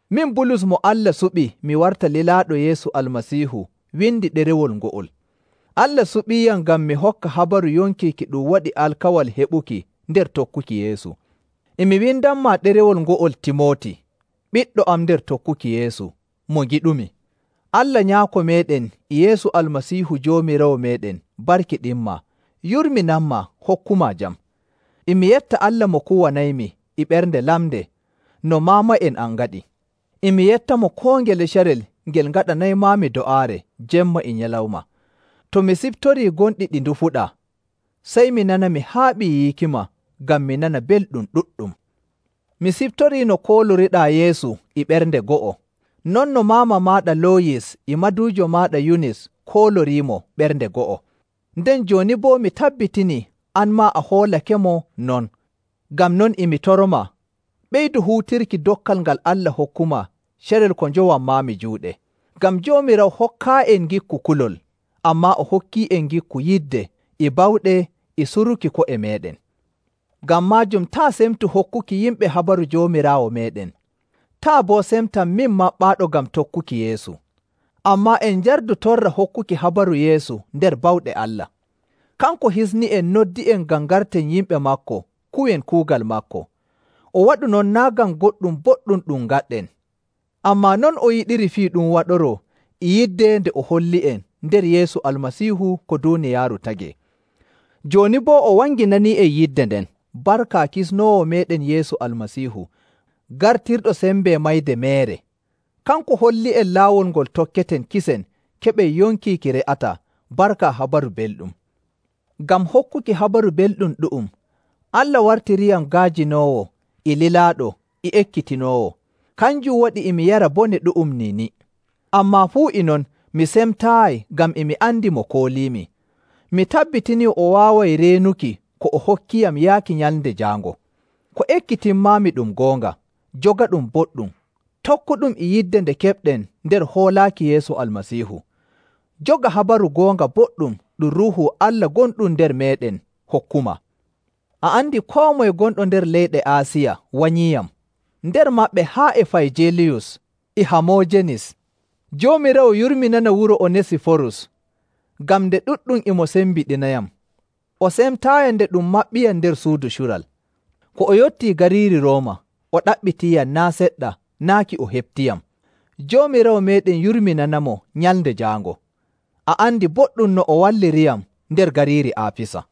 Min Bulus mo Allah suɓi mi warta lilaaɗo Yeesu Almasiihu windi ɗerewol ngo'ol. Allah suɓiiyam ngam mi hokka habaru yonki ki ɗum waɗi alkawal heɓuki nder tokkuki Yeesu. E mi windanmaa ɗerewol ngo'ol Timooti, ɓiɗɗo am nder tokkuki Yeesu, mo ngiɗumi. Allah Nyaako meeɗen e Yeesu Almasiihu Joomiraawo meeɗen barkiɗinmaa, yurminanmaa hokkumaa jam. E mi yetta Allah mo kuwanaymi e ɓernde lamnde, no maama'en am ngaɗi. E mi yettamo koo ngele carel ngel ngaɗanaymaami do'aare jemma e nyalawma. To mi siftorii gonɗi ɗi ndufuɗaa, sey mi nana mi haaɓii yiikima ngam mi nana belɗum ɗuɗɗum. Mi siftorii no kooloriɗaa Yeesu e ɓernde go'o, non no maama maaɗa Looyis e maduujo maaɗa Yunis kooloriimo ɓernde go'o, nden jooni boo mi tabbitinii an maa a hoolakemo non. Ngam non e mi toromaa, ɓeydu huutirki dokkal ngal Allah hokkumaa carel ko njowanmaami juuɗe. Ngam Joomiraawo hokkaayi'en ngikku kulol, ammaa o hokkii'en ngikku yidde e bawɗe e suruki ko'e meeɗen. Ngam maajum taa' semtu hokkuki yimɓe habaru Joomiraawo meeɗen, taa' boo semtam min maɓɓaaɗo ngam tokkuki Yeesu. Ammaa en njardu torra hokkuki habaru Yeesu nder bawɗe Allah. Kanko hisni'en, noddi'en ngam ngarten yimɓe maako kuwen kuugal maako. O waɗu non naa' ngam goɗɗum boɗɗum ɗum ngaɗɗen, ammaa non o yiɗiri fii ɗum waɗoroo e yidde nde o holli'en nder Yeesu Almasiihu ko duuniyaaru tagee. Jooni boo o wanginanii'en yidde nden barka Kisnoowo meeɗen Yeesu Almasiihu, gartirɗo sembe mayde meere. Kanko holli'en laawol ngol tokketen kisen keɓen yonki ki re'ataa barka Habaru Belɗum. Ngam hokkuki Habaru Belɗum ɗu'um, Allah wartiriyam ga'ajinoowo e lilaaɗo e ekkitinoowo. Kanjum waɗi e mi yara bone ɗu'um niini, ammaa fuu e non mi semtaayi ngam e mi andi mo kooliimi. Mi tabbitinii o waaway reenuki ko o hokkiyam yaaki Nyalnde Jaango. Ko ekkitinmaami ɗum goonga. Jogaɗum boɗɗum, tokkuɗum e yidde nde keɓɗen nder hoolaaki Yeesu Almasiihu. Joga habaru goonga boɗɗum ɗum Ruuhu Allah gonɗum nder meeɗen hokkumaa. A andi koo moye gonɗo nder leyɗe Aasiya wanyiiyam, nder maɓɓe haa e Fayjelus e Hamoojenis. Joomiraawo yurminana wuro Onesiforus ngam nde ɗuɗɗum e mo sembiɗinayam, o semtaayiyam nde ɗum maɓɓiyam nder suudu cural. Ko o yottii gariiri Rooma, o ɗaɓɓitiiyam naa' seɗɗa naaki o heɓtiyam. Joomiraawo meeɗen yurminanamo Nyalnde Jaango. A andi boɗɗum no o walliriyam nder gariiri Aafisa.